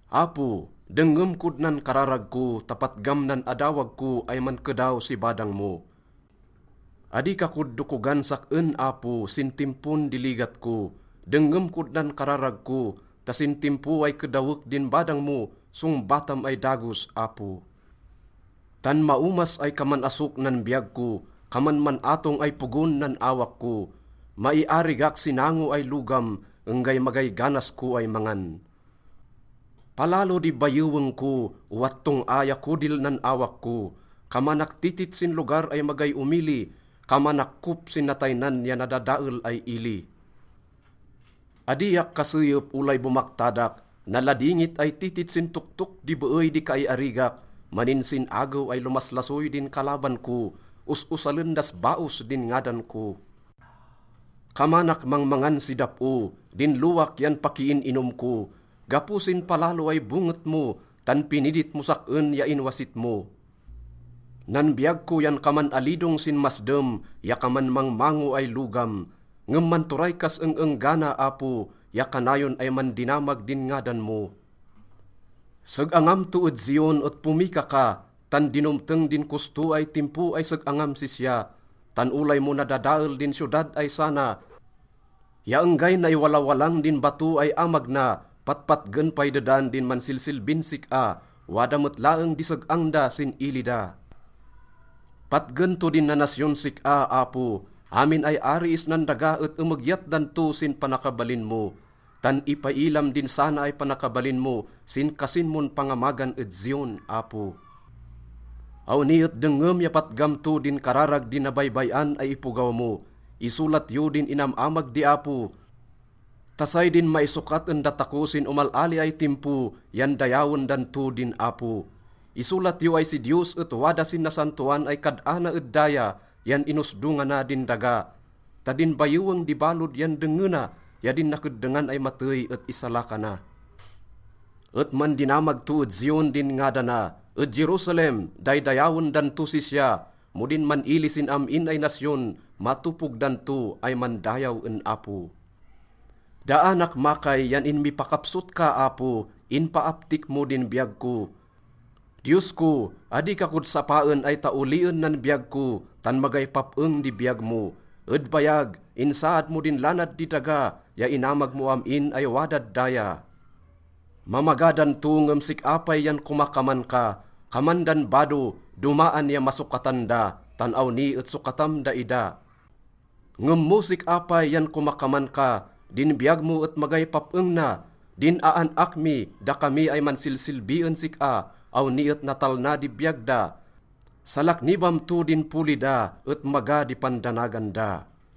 Apo, dengngem kod nan kararag ko ta patgam nan adawag ko ay mankedaw si badang mo. Adi ka kod dokogan sak-en, Apo, sin timpon di ligat ko. Dengngem kod nan kararag ko ta sin timpo ay kedawek din badang mo, songbatam ay dagos, Apo. Tan maomas ay kaman asok nan biyag ko, kaman man-atong ay pogon nan awak ko. Maiarigak si nango ay logam, enggay magay ganas ko ay mangan. Palalo di bayeweng ko, owat tong-a ya kodil nan awak ko. Kamanak titit sin lugar ay magay omili, kamanak kop sin nataynan ya nadadael ay ili. Adiak kaseyep olay bomaktadak, naladingit ay titit sin toktok di beey di kaiarigak. Maninsin-agew ay lomaslasoy din kalaban ko, os-osalen das baos din ngadan ko. Kamanak mangmangan si dap-o, din lowak yan pakiin-inom ko gapo sin palalo ay bonget mo, tan pinidit mos sak-en ya inwasit mo. Nan biyag ko yan kaman alidong sin masdem ya kaman mangmango ay logam. Ngem manturay kas eng-enggana, Apo, ya kanayon ay mandinamag din ngadan mo. Seg-angam to ed Zion et pomika ka, tan dinomteng din kosto ay timpo ay seg-angam sisya. Tan olay mo nadadael din siyodad ay sana ya enggay naiwalawalang din bato ay amag na, patpatgen pay dedan din mansilsilbin sik-a, wada met laeng di seg-ang da sin ili da. Patgen to din nanasyon sik-a, Apo, amin ay ari isnan daga et emegyat dan to sin panakabalin mo. Tan ipailam din sana ay panakabalin mo sin kasin mon pangamagan ed Zion, Apo. Awni et dengngem ya patgam to din kararag di nabaybay-an ay ipogaw mo. Isolat yo din inam-amag di Apo ta say din maisokat en datako sin omal-ali ay timpo yan dayawen dan to din Apo. Isolat yo ay si Diyos et wada sin nasantoan ay kad-ana ed daya, yan inosdongana din daga ta din bayeweng di balod yan dengngena ya din nakeddengan ay matey et isalakana. Et mandinamag to ed Zion din ngadana, ed Jerusalem, daydayawen dan tos sisya mo din man-ili sin am-in ay nasyon, matopog dan to ay mandayaw en Apo. Daanak makay yan inmipakapsot ka, Apo, inpaaptik mo din biyag ko. Diyos ko, adi ka kod sapaen ay taolien nan biyag ko, tan magay pap-eng di biyag mo. Ed bayag, insaad mo din lanad di daga ya inamag mo am-in ay wadad daya. Mamaga dan to ngem sik-a pay yan komakaman ka. Kaman dan bado, domaan ya masokatan da, tan awni et sokatam daida. Ngem mo sik-a pay yan komakaman ka, din biyag mo et magay pap-eng na. Din aan-ak mi, dakami ay mansilsilbi en sik-a, awni et natalna di biyag da. Salaknibam to din poli da et maga di pandanagan da.